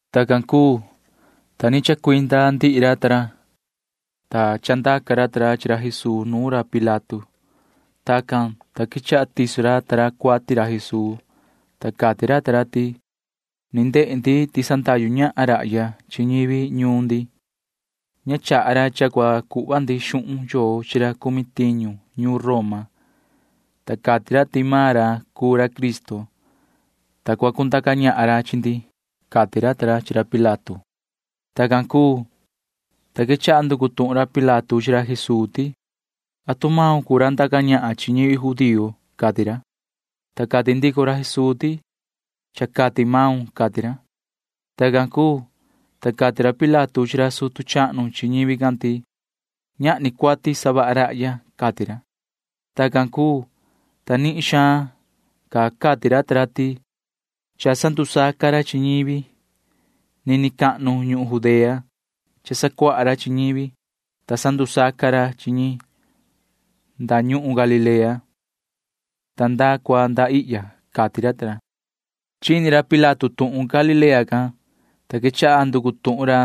Tacan cuu, ta ni chacuinda ndihi ra ta ra, ta chandaca ra ta ra chi ra Jesuu nuun ra Pilato. Tacan, ta quechaha tiso ra ta ra cuati ra Jesuu, ta cati ra ta ra ti: ―Ni ndehe ndi ti sandahyu ñahan rahya chi ñivi ñuun ndi. Ña chaha ra cha cua cuhva ndi xuhun yoo chi ra cumi tiñu ñuun Roma, ta cati ra ti maan ra cuu ra Cristo, ta cua cundaca ñahan ra chi ndi ―cati ra ta ra chi ra Pilato. Tacan cuu, ta quechaha nducu tuhun ra Pilato chi ra Jesuu ti: ―¿Atu maun cuu ra ndaca ñahan chi ñivi judío? ―cati ra. Ta cati ndico ra Jesuu ti: ―Cha cati maun ―cati ra. Tacan cuu, ta cati ra Pilato chi ra sutu chahnu chi ñivi can ti: ―Ñahni cuati savaha rahya ―cati ra. Tacan cuu, ta nihin xaan ca cati ra ta ra ti: ―Cha sandusaca ra chi ñivi. Nini cahnu ñuhun Judea cha sacuaha ra chi ñivi, ta sandusaca ra chi ñi nda ñuhun Galilea ta nda cua nda ihya ―cati ra ta ra. Chini ra Pilato tuhun Galilea can, ta quechaha nducu tuhun ra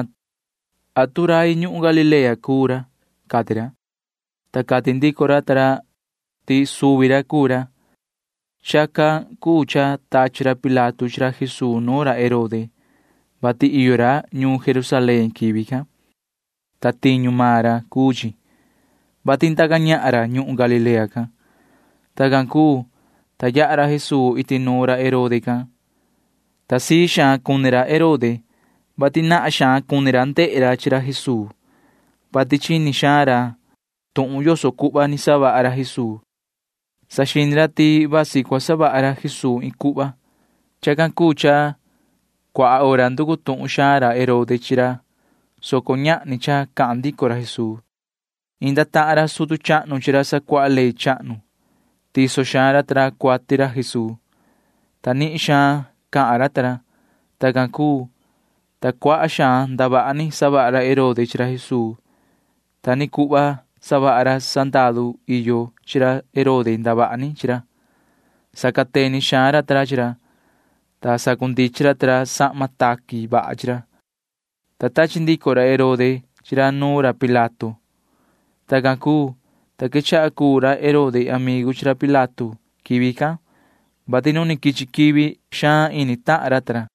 atu rai ñuhun Galilea cuu ra, cati ra, ta cati ndico ra ta ra ti suvi ra cuu ra. Chacan cuu cha tachi ra Pilato chi ra Jesuu nuun ra Herode, vati iyo ra ñuun Jerusalén quivi can, ta tiñu maan ra cuu chi, [vati ndaca ñahan ra ñuhun Galilea can]. Tacan cuu, ta yaha ra Jesuu iti nuun ra Herode can, ta sii xaan cuni ra Herode, vati nahan xaan cuni ra ndehe ra chi ra Jesuu, vati chini xaan ra tuhun yoso cuhva ni savaha ra Jesuu. Saxini ra ti vasi cua savaha ra Jesuu iin cuhva. Chacan cuu cha cuaha hora nducu tuhun xaan ra Herode chi ra, soco ñahni cha cahan ndico ra Jesuu. Inda tahan ra sutu chahnu chi ra sacuaha ley chahnu. Tiso xaan ra ta ra cuati ra Jesuu, ta nihin xaan cahan ra ta ra. Tacan cuu, ta cuaha xaan ndavaha ni savaha ra Herode chi ra Jesuu. Ta ni cuhva savaha ra sandaru iyo chi ra Herode ndavaha ni chi ra. Sacateni xaan ra ta ra chi ra, ta sacundichin ra ta ra sahma taqui vaha chi ra, ta tachi ndico ra Herode chi ra nuun ra Pilato. Tacan cuu, ta quechaha cuu ra Herode amigu chi ra Pilato quivi can, vati nu ni quichi quivi can xaan ini tahan ra ta ra.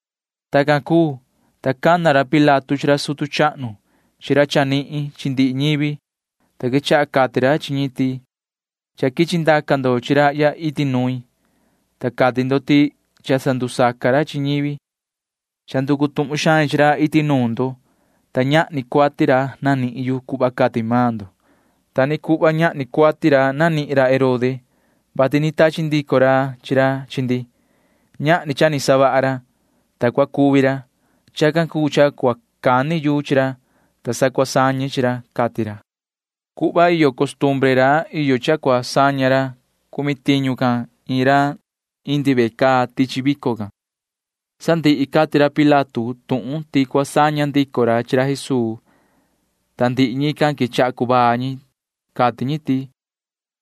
Tacan cuu, ta cana ra Pilato chi ra sutu chahnu chi ra chanihin chi ndihi ñivi, ta quechaha cati ra chi ñi ti: ―Cha quichi ndaca ndo chi rahya iti nuin, ta cati ndo ti cha sandusaca ra chi ñivi. Cha nducu tuhun xain chi ra iti nuun ndo, ta ñahni cuati ra nanihin yu cuhva cati maan ndo. Ta ni cuhva ñahni cuati ra nanihin ra Herode, vati ni tachi ndico ra chi ra chi ndi. Ñahni cha ni savaha ra, ta cua cuvi ra. Chacan cuu cha cua cani yu chi ra, ta cua sañe chi ra ―cati ra. Cuhva iyo costumbre ra iyo cha cua saña ra cumi tiñu can iin ra indi ve caa tichi vico can. Sandihi cati ra Pilato tuhun ti cua saña ndico ra chi ra Jesuu, ta ndihi ñican quechaha cuvaa ñi. Cati ñi ti: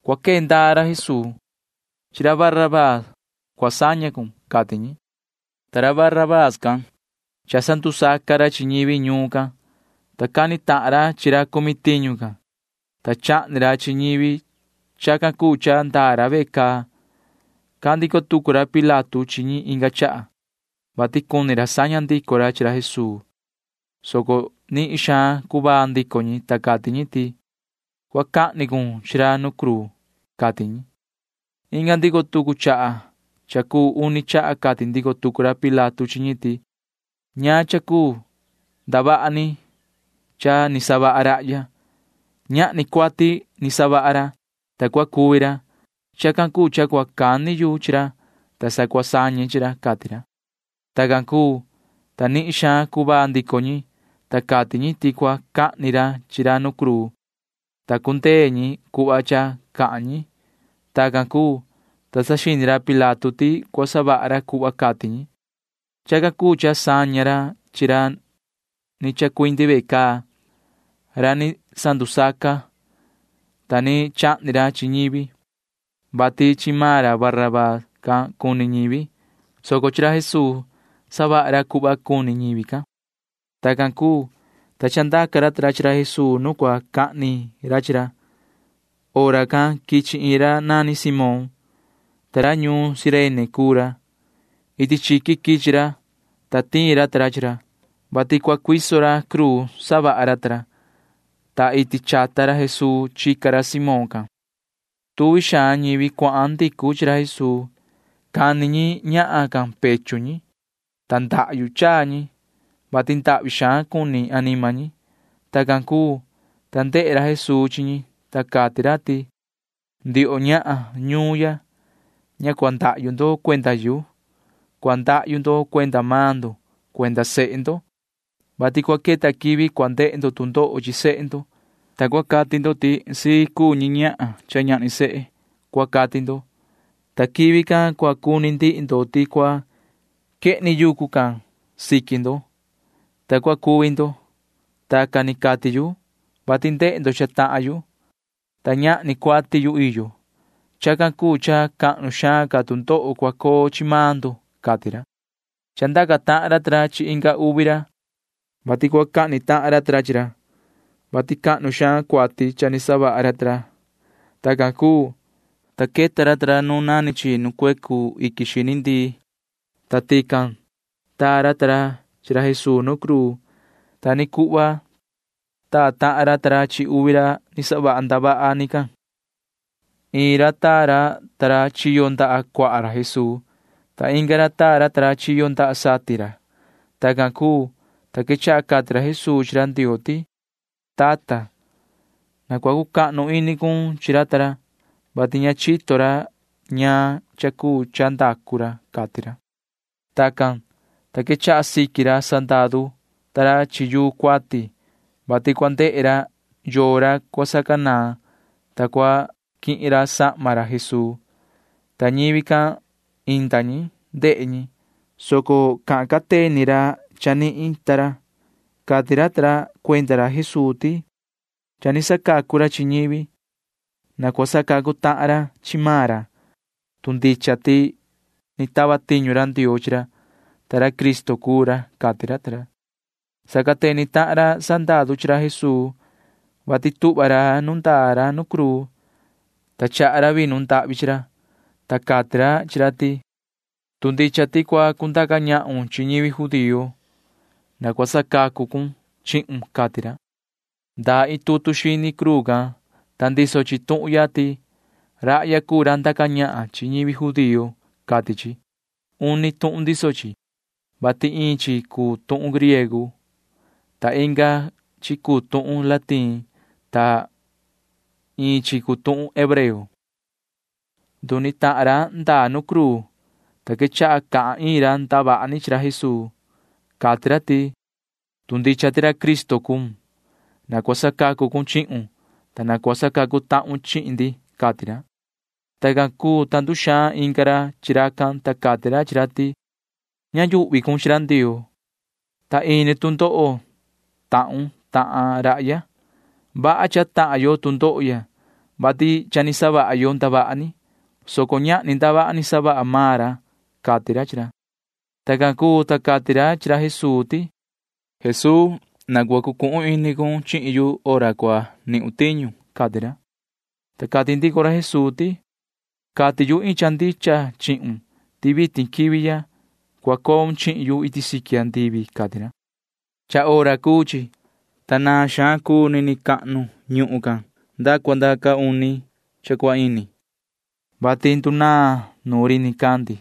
―¡Cua quee ndaa ra Jesuu! ¡Chi ra Barabaa cua saña cun! ―cati ñi. Ta ra Barabaa can―cha sandusaca ra chi ñivi ñuun can, ta cani tahan ra chi ra cumi tiñu can, ta chahni ra chi ñivi. Chacan cuu cha ndaa ra ve caa. Cahan ndico tucu ra Pilato chi ñi inga chaha, vati cuni ra saña ndico ra chi ra Jesuu, soco nihin xaan cuvaa ndico ñi, ta cati ñi ti: ―¡Cua cahni cun chi ra nu cruu! ―cati ñi. Inga ndico tucu chaha cha cuu uni chaha cati ndico tucu ra Pilato chi ñi ti: ―¿Ñaan cha cuu ndavaha ni cha ni savaha rahya? Ñahni cuati ni savaha ra, ta cua cuvi ra. Chacan cuu cha cua cani yu chi ra, ta sa cua sañe chi ra ―cati ra. Tacan cuu, ta nihin xaan cuvaa ndico ñi, ta cati ñi ti cua cahni ra chi ra nu cruu, ta cundee ñi cuhva cha cahan ñi. Tacan cuu, ta saxini ra Pilato ti cua savaha ra cuhva cati ñi. Chacan cuu cha saña ra chi ra ni chacuindi ve caa―ra ni sandusaca, ta ni chahni ra chi ñivi, vati chi maan ra Barabaa can cuni ñivi, soco chi ra Jesuu savaha ra cuhva cuni ñivi can. Tacan cuu, ta chandaca ra ta ra chi ra Jesuu nu cua cahni ra chi ra. Hora can quichi iin ra nani Simón, ta ra ñuun Cirene cuu ra. Iti chiqui quichi ra, ta tiin ra ta ra chi ra, vati cua cuiso ra cruu savaha ra ta ra, ta iti chata ra Jesuu chica ra Simón can. Tuvi xaan ñivi cuahan ndicu chi ra Jesuu. Cani ñi ñahan can pechu ñi, ta ndahyu chaa ñi, [vati ndahvi xaan cuni anima ñi]. Tacan cuu, ta ndehe ra Jesuu chi ñi, ta cati ra ti: ―Ndioho ñahan ñuun ya, ña cua ndahyu ndo cuenda yu. Cua ndahyu ndo cuenda maan ndo cuenda sehe ndo, vati cua queta quivi cua ndehe ndo tu ndoho chi sehe ndo, ta cua cati ndo ti sii cuni ñi ñahan cha ñahni sehe, cua cati ndo, ta quivi can cua cuni ndihi ndo ti cua quehni yucu can siqui ndo, ta cua cuvi ndo. Tacan ni cati yu, vati ndehe ndo cha tahan yuhu, ta ñahni cuati yu iyo. Chacan cuu cha cahnu xaan ca tu ndoho cua coo chi maan ndo ―cati ra. Chandaca tahan ra ta ra chi inga uvi ra, vati cua cahni tahan ra ta ra chi ra, vati cahnu xaan cuati cha ni savaha ra ta ra. Tacan cuu, ta queta ra ta ra nu nani chi nu cuecu iquin xini ndii, ta tican taa ra ta ra chi ra Jesuu nu cruu. Ta ni cuhva taa tahan ra ta ra chi uvi ra ni savaha ndavaha ni can. Iin ra taa ra ta ra chiyo ndaha cuaha ra Jesuu, ta inga ra taa ra ta ra chiyo ndaha satin ra. Tacan cuu, ta quechaha cati ra Jesuu chi ra Ndioo ti: ―Tata, na cua cucahnu ini cun chi ra ta ra, vati ña chito ra ñaan cha cuu cha ndacu ra ―cati ra. Tacan, ta quechaha siqui ra sandaru ta ra chi yuu cuati, vati cua ndehe ra yoo ra cua sacanaan, ta cua quihin ra sahma ra Jesuu. Ta ñivi can―inda ñi. Ndehe ñi, soco cahan cateni ra chanihin ta ra. Cati ra ta ra cuenda ra Jesuu ti: ―Cha ni sacacu ra chi ñivi. Na cua sacacu tahan ra chi maan ra, tu ndicha ti ni tava tiñu ra Ndioo chi ra, ta ra Cristo cuu ra ―cati ra ta ra. Sacateni tahan ra sandaru chi ra Jesuu, vati tuhva ra nu ndaa ra nu cruu, ta chaha ra vinu ndahvi chi ra, ta cati ra chi ra ti: ―Tu ndicha ti cua cundaca ñahun chi ñivi judío can, na cua sacacu cun chihun ―cati ra. Ndaa iin tutu xini cruu can, ta ndiso chi tuhun ya ti: “Rahya cuu ra ndaca ñahan chi ñivi judío,” cati chi. Uni tuhun ndiso chi, vati iin chi cuu tuhun griego, ta iin chi cuu tuhun latín, ta iin chi cuu tuhun hebreo. Nduni tahan ra ndaa ra nu cruu, ta quechaha cahan iin ra ndavaha ni chi ra Jesuu. Cati ra ti: ―Tu ndicha ti ra Cristo cuun, na cua sacacu cun chihun, ta na cua sacacu tahun chi ndi ―cati ra. Tacan cuu, ta nduxaan inga ra chi racan, ta cati ra chi ra ti: ―Ña yuhvi cun chi ra Ndioo, ta ini tu ndoho tahun tahan rahya. Vaha cha tahan yo tu ndoho ya, vati cha ni savaha yo ndavaha ni, soco ñahni ndavaha ni savaha maan ra ―cati ra chi ra. Tacan cuu, ta cati ra chi ra Jesuu ti: ―Yoho Jesuu, na cua cucuhun ini cun chihin yu hora cua nihun tiñu ―cati ra. Ta cati ndico ra Jesuu ti: ―Cati yu iin cha ndicha chihun ti vitin quivi ya cua coun chihin yu iti siqui andivi ―cati ra. Cha hora cuu chi, ta naan xaan cuu nini cahnu ñuhun can nda cua nda caa uni cha cua ini, vati ndunaan nuun ri nicandi,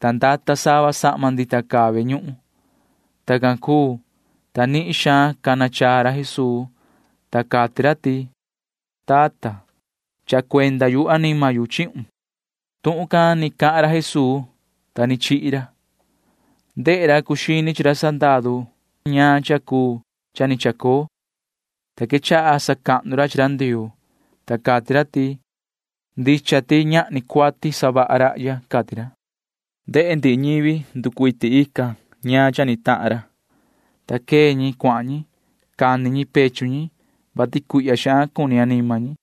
ta ndata sava sahma ndita caa ve ñuhun. Tacan cuu, ta nihin xaan cana chaa ra Jesuu, ta cati ra ti: ―Tata, chaha cuenda yu anima yu chihun. Tuhun can ni cahan ra Jesuu, ta ni chihi ra. Ndehe ra cuu xini chi ra sandaru can ñaan cha cuu cha ni chacoo, ta quechaha sacahnu ra chi ra Ndioo, ta cati ra ti: ―Ndicha ti ñahni cuati savaha rahya ―cati ra. Ndehe ndihi ñivi nducuiti tican ñaan cha ni tahan ra, ta quee ñi cuahan ñi. Cani ñi pechu ñi, [vati cuihya xaan cuni anima ñi].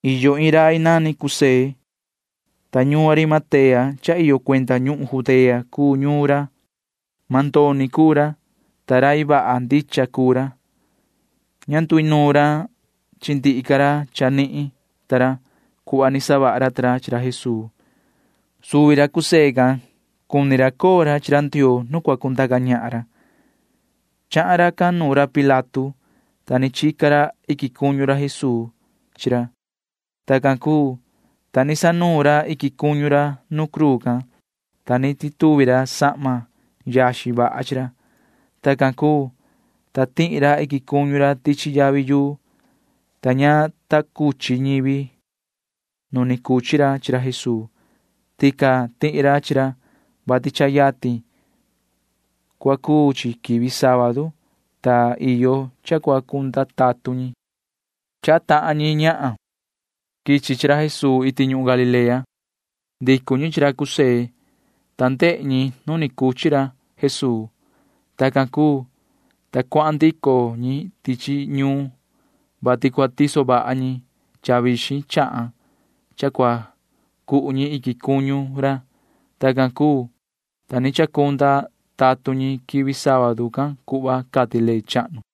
Iyo iin rai nani José, ta ñuun Arimatea cha iyo cuenda ñuhun Judea cuu ñuun ra. Mandoni cuu ra, ta rai vaha ndicha cuu ra. Ña nduinuun ra chi ndihi ca ra chanihin ta ra cuhva ni savaha ra ta ra chi ra Jesuu. Suvi ra José can cuni ra coo ra chi ra Ndioo nu cua cundaca ñahan ra. Chahan racan nuun ra Pilato, ta ni chica ra iquin cuñu ra Jesuu chi ra. Tacan cuu, ta ni sanuun ra iquin cuñu ra nuun cruu can, ta ni tituvi ra sahma yaxin vaha chi ra. Tacan cuu, ta tihi ra iquin cuñu ra tichi yavi yuu, ta ña ta cuchi ñivi nu ni cuchi ra chi ra Jesuu. Tican tihi ra chi ra, vati cha yatin cua cuu chi quivi sábadu, ta iyo cha cua cunda tatun ñi. Chahan tahan ñi ñahan quichi chi ra Jesuu iti ñuhun Galilea. Ndicu ñi chi ra José, ta ndehe ñi nu ni cuchi ra chi ra Jesuu. Tacan cuu, ta cuahan ndico ñi tichi ñuun, vati cua tiso vaha ñi cha vixin chahan cha cua cu cuhu ñi iquin cuñu ra. Tacan cuu, ta ni chacunda tatun ñi quivi sábadu can cuhva cati ley chahnu.